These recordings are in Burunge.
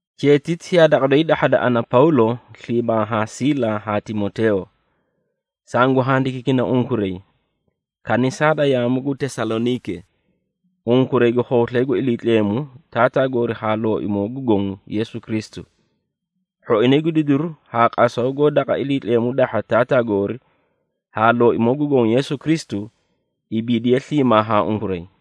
Cheetiti yaa daqa doyi dahhada ana, Pawlo, sliimaa haa Siila haa Timoteeyo. Sangu handikiikina unkuray, kanisaa da yaamu gu Tesaloniike, unkuray gu khooslay gu Iliitleemu Taataa goori haa Looimoo gu Goõ Yeesu Kristu. Hhoinay gu didiru haa qasaw goó daqa Iliitleemu dahha Taataa goori, haa Looimoo gu Goõ Yeesu Kristu, ibiidiye sliimaa haa unkuray.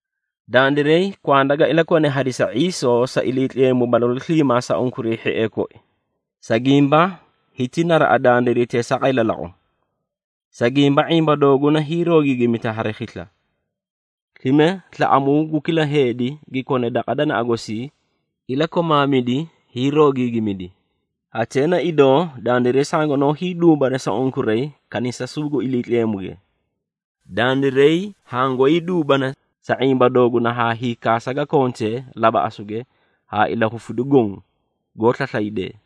Dandiray kwanda ga ilakone hadisa ⁄iisoo sa Iliitleemu balalu sliimaa sa unkuray hhiee koi, sa gimba hiti naraꞌa dandiray teesaaqay lalaqu. Sa gimba, ⁄imba dooguna hiiroogiigimita hari khisla. Slime slaꞌamuu gu kila heedi gi kone daqa danaꞌa gosii, ilakomaamidi hiiroogiigimidi. Hatee na idoo, dandiray sangunoó hiiduubana sa unkuray kanisasuu gu Iliitleemuge. Dandiray hangoóy duubana, sa ⁄imba dooguna haa hiikaasa ga kontee labaꞌasuge haa ilahufidu goõ, goó slaslaydee.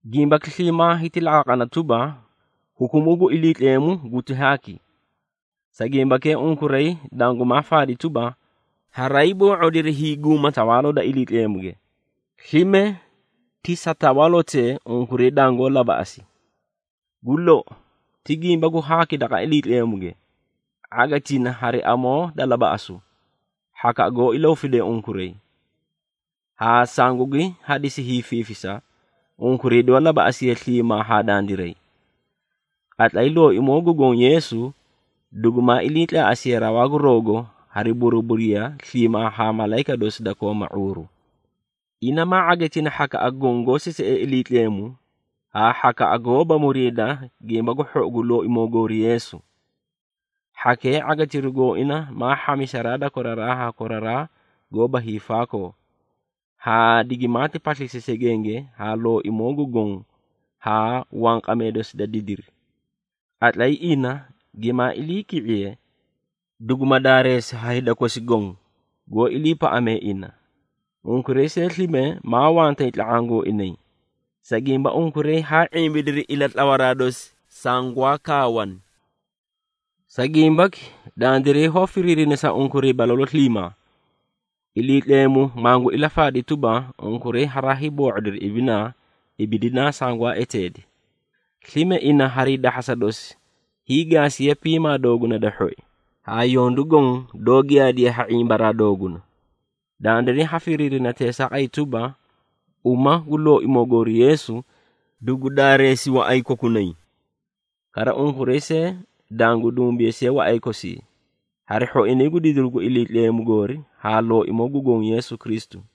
Gimbaki sliimaa hiti laqaaqana tuba, hukumuu gu Iliitleemu guti haaki. Sa gimbakee unkuray dangumaa faadi tuba, haraay boo⁄odiri hiiguma Tawaaloo da Iliitleemuge, slime ti sa tawaalotee unkuray dangoó labaꞌasi. Gu lou, ti gimba gu haaki daqa Iliitleemuge ⁄agitina hari amoo da labaꞌasu, hhakaꞌa goó ilahufidee unkuray, haa sangugi hadisi hiifiifisa, unkuray doó labaꞌasiye sliimaa haa dandiray. Qatlay Looimoo gu Goõ Yeesu, dugumaa iliitlaaꞌasiye rawaa gu rawgo hari buruburiya sliimaa haa malayika dosi da kooma ⁄uuru. Ina maa ⁄agitina hhakaꞌa goõ, goó sisiee Iliitleemu, haa hhakaꞌa goóba muriida Gimba gu Hhou gu Looimoo goori Yeesu. Hhakee, ⁄agitiru gooina maa hhamisaraa da koraraa haa koraraa goóba hiifaakoo, haa digimaati paslisi segenge haa Looimoo gu Gongo haa wanqamee dosi da didiri. Qatlay ina gimaa iliiki⁄iye, duguma daareesi haa hida kosi goõ, goó iliipaꞌamee ina. Unkuray see, slime maa wantay tla⁄aã gooinay, sa gimba unkuray haa ⁄imbidiri ilatlawaraa dosi sangwaa kaawani. Sa gimbaki, dandiray hoó firiirina sa unkuray balalu sliimaa, Iliitleemu mangu ilafaadi tuba, unkuray haraay boo⁄odiri ibinaa ibidinaa sangwaa eteedi. Slime, ina harii dahhasa dosi hiigaasiye piimaa dooguna da hhoi, haa yondu goõ doó giyaadiye ha ⁄imbaraa dooguna. Dandiray ha firiirina teesaaqay tuba, uma gu Looimoo goori Yeesu, dugu daareesi waꞌay kokunay. Kara unkuray see, dangu dumbeesiye waꞌay kosii, hari hhoinay gu didiru gu Iliitleemu goori haa Looimoo gu Goõ Yeesu Kristu.